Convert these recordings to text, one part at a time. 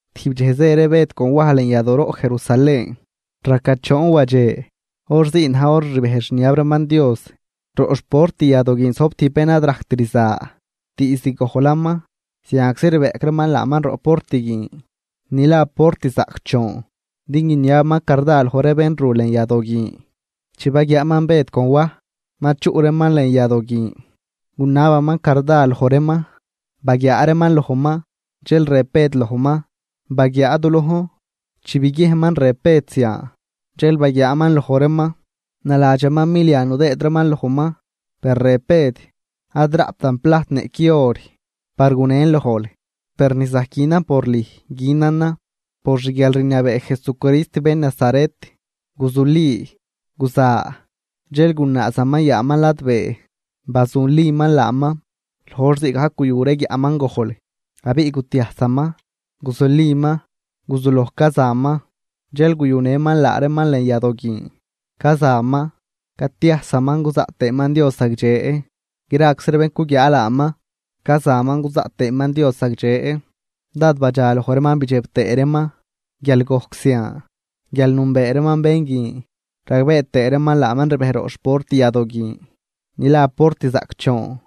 Tijb dxej zë ree Bëd con Waj lën yadooroꞌ Jerusalén raca choon wadxe, hor zii na̱j hor ni rbejdx rniab reeman Dios. Roꞌ xport yadoo guin zojb tijb bén ad rajct rza diizd gojlaman. Zianczi rbeꞌc reeman laaman roꞌ port guin, ni la Port Zaꞌcdxoon, din guiniabaman carda loj ree bén ru lën yadoo guin. Chi baguiaaman Bëd con Waj ma chuꞌ reeman lën yadoo guin, gunabaman carda loj reeman. Baguiaa reeman lojman, dxel rëb Bëd lojman: ―Baguiaa du lojn. Chi biguiejnman rëb Bëd zian, dxel baguiaaman loj reeman, naladxaman milia nudëëd reeman lojman. Per rëb Bëd: ―Ad raꞌptan plajt niꞌqui or par gunen lojl, per ni zajc günan por lüj günanan: Por xguialrniabee Jesucrist bén Nazaret, guzuli, guza. Dxel gunaazaman yaaman ladbee, bazuliman laaman. Loj hor zii gajc guyu ree guiaꞌman gojl, abiꞌ gutiajsaman, guzuliman guzuloj cazaman. Dxel guyunëman laa reeman lën yadoo guin, cazaman, catiajsaman cuzaꞌt tëëman Dios zagdxe. Graczi ree bén cuguiaa laaman cazaman cuzaꞌt tëëman Dios zagdxe, dád badxa loj reeman bidxeb tëë reeman guial gojc zian guial nünbee reeman bén guin, ragbee tëë reeman laaman rbej roꞌ xport yadoo guin ni la Port Zaꞌcdxoon,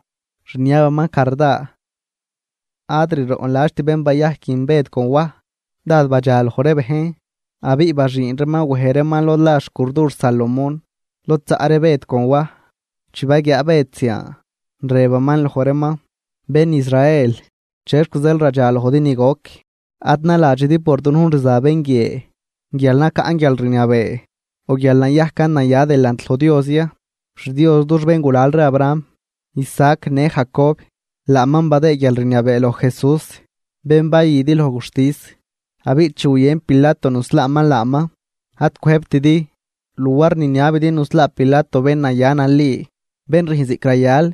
rniabaman carda. Ad riroꞌnladxt bén bayajc guin Bëd con Waj. Dád badxa loj ree bejn, abiꞌ baxüün reeman wej reeman lod la xcurdur Salomón lod zaꞌ ree Bëd con Waj. Chi baguiaa Bëd zian, rëbaman loj reeman: ―Bén Israel, ¿chexc zeel radxa lojdi ni goc? Ad naladxidi por dunujn rza bén guie guial nacaꞌn guialrniabee o guial nayajcan naya delant loj Dios ya. XDios dux béngulal ree Abraham, Isaac në Jacob, laaman badëë guialrniabee loj Jesús, bén bayüdi loj guxtis. Abiꞌ chi guyën Pilato nuslaaman laaman, ad cwëjbtidi. Luar niniabidi nuslaa Pilato bén naya nali, bén rüjn ziꞌc rayal,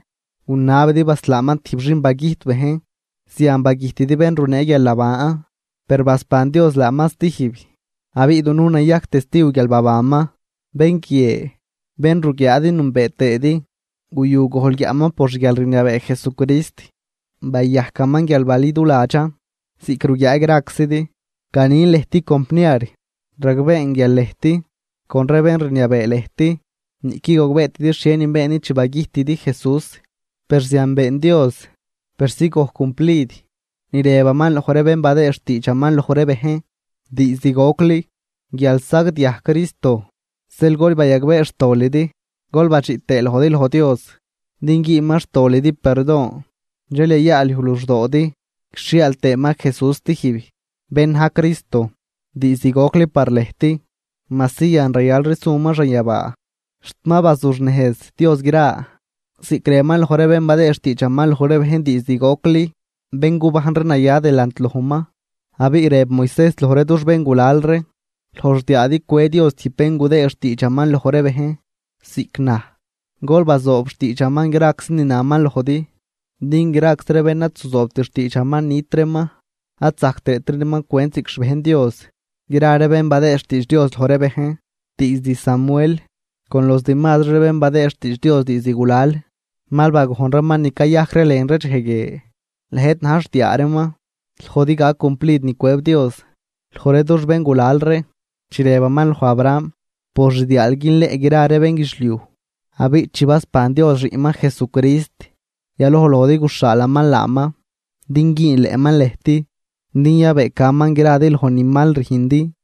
gunabidi baslaaman tijb xin bagüjt bejn. Zian bagüjtidi bén runee guialnaban. Per basban Dios laaman stijb, abiꞌ dunujn nayajc testiw guial babanman. Bén guie, bén ruguiaadi nünbee tëëdi, guyu gojl guiaꞌman por xguialrniabee Jesucrist, bayajcaman guial baliduladxan, ziꞌc ruguiaa graczidi. ’Ganin lëjt compniar, ragbeen guial lëjt con ree bén rniabee lëjt niꞌquid gogbeetidi xhienin beendi chi bagüjtidi Jesús. Per zian been Dios persi gojc cumplid ni rëbaman loj ree bén badëë xtiidxaman loj ree bejn diizd gocli guial sagdiaj Cristo. Zeel gol bayagbee xtolidi gol badxiꞌ tëë lojdi loj Dios din güünman xtolidi perdon. Dxel yayaalyuj luxdoodi, guixhiaal tëëman Jesús stijb, bén na̱j Cristo diizd gocli par lëjt, majsi yan rayalri suman xanyabaa, xt ma bazuxnejz Dios gra, ziꞌc rëbaman loj ree bén badëë xtiidxaman loj ree bejn diizd gocli, bén gubajn ree naya delant lojman. Abiꞌ rëb Moisejs loj ree dux béngulal ree: “Loj xdiaadi cwëë Dios tijb bén gudëë xtiidxaman loj ree bejn ziꞌc naj, gol bazoob xtiidxaman graczi ni naman lojdi, din graczi ree bén ad zuzoobt xtiidxaman nit reeman, ad zajc tëëtri reeman cwent ziꞌc xbejn Dios.” ’Gra ree bén badëëd xtiidx Dios loj ree bejn, diizd Samuel con los demazri ree bén badëë xtiidx Dios diizd gulal, mal bagojn reeman ni cayajc ree lën ree dxej guie. Lëjt na̱j xdiaa reeman, lojdi gac cumplid ni cwëb Dios loj ree dux béngulal ree chi rëbaman loj Abraham: “Por xdiaal günleꞌn gra ree bénguidxliuj.” Abiꞌ chi basban Dios xiꞌnman Jesucrist, yaloj lojdi guxhaalaman laaman din güünleꞌman lëjt din yabëëcaman gradi loj ni mal rüjndi.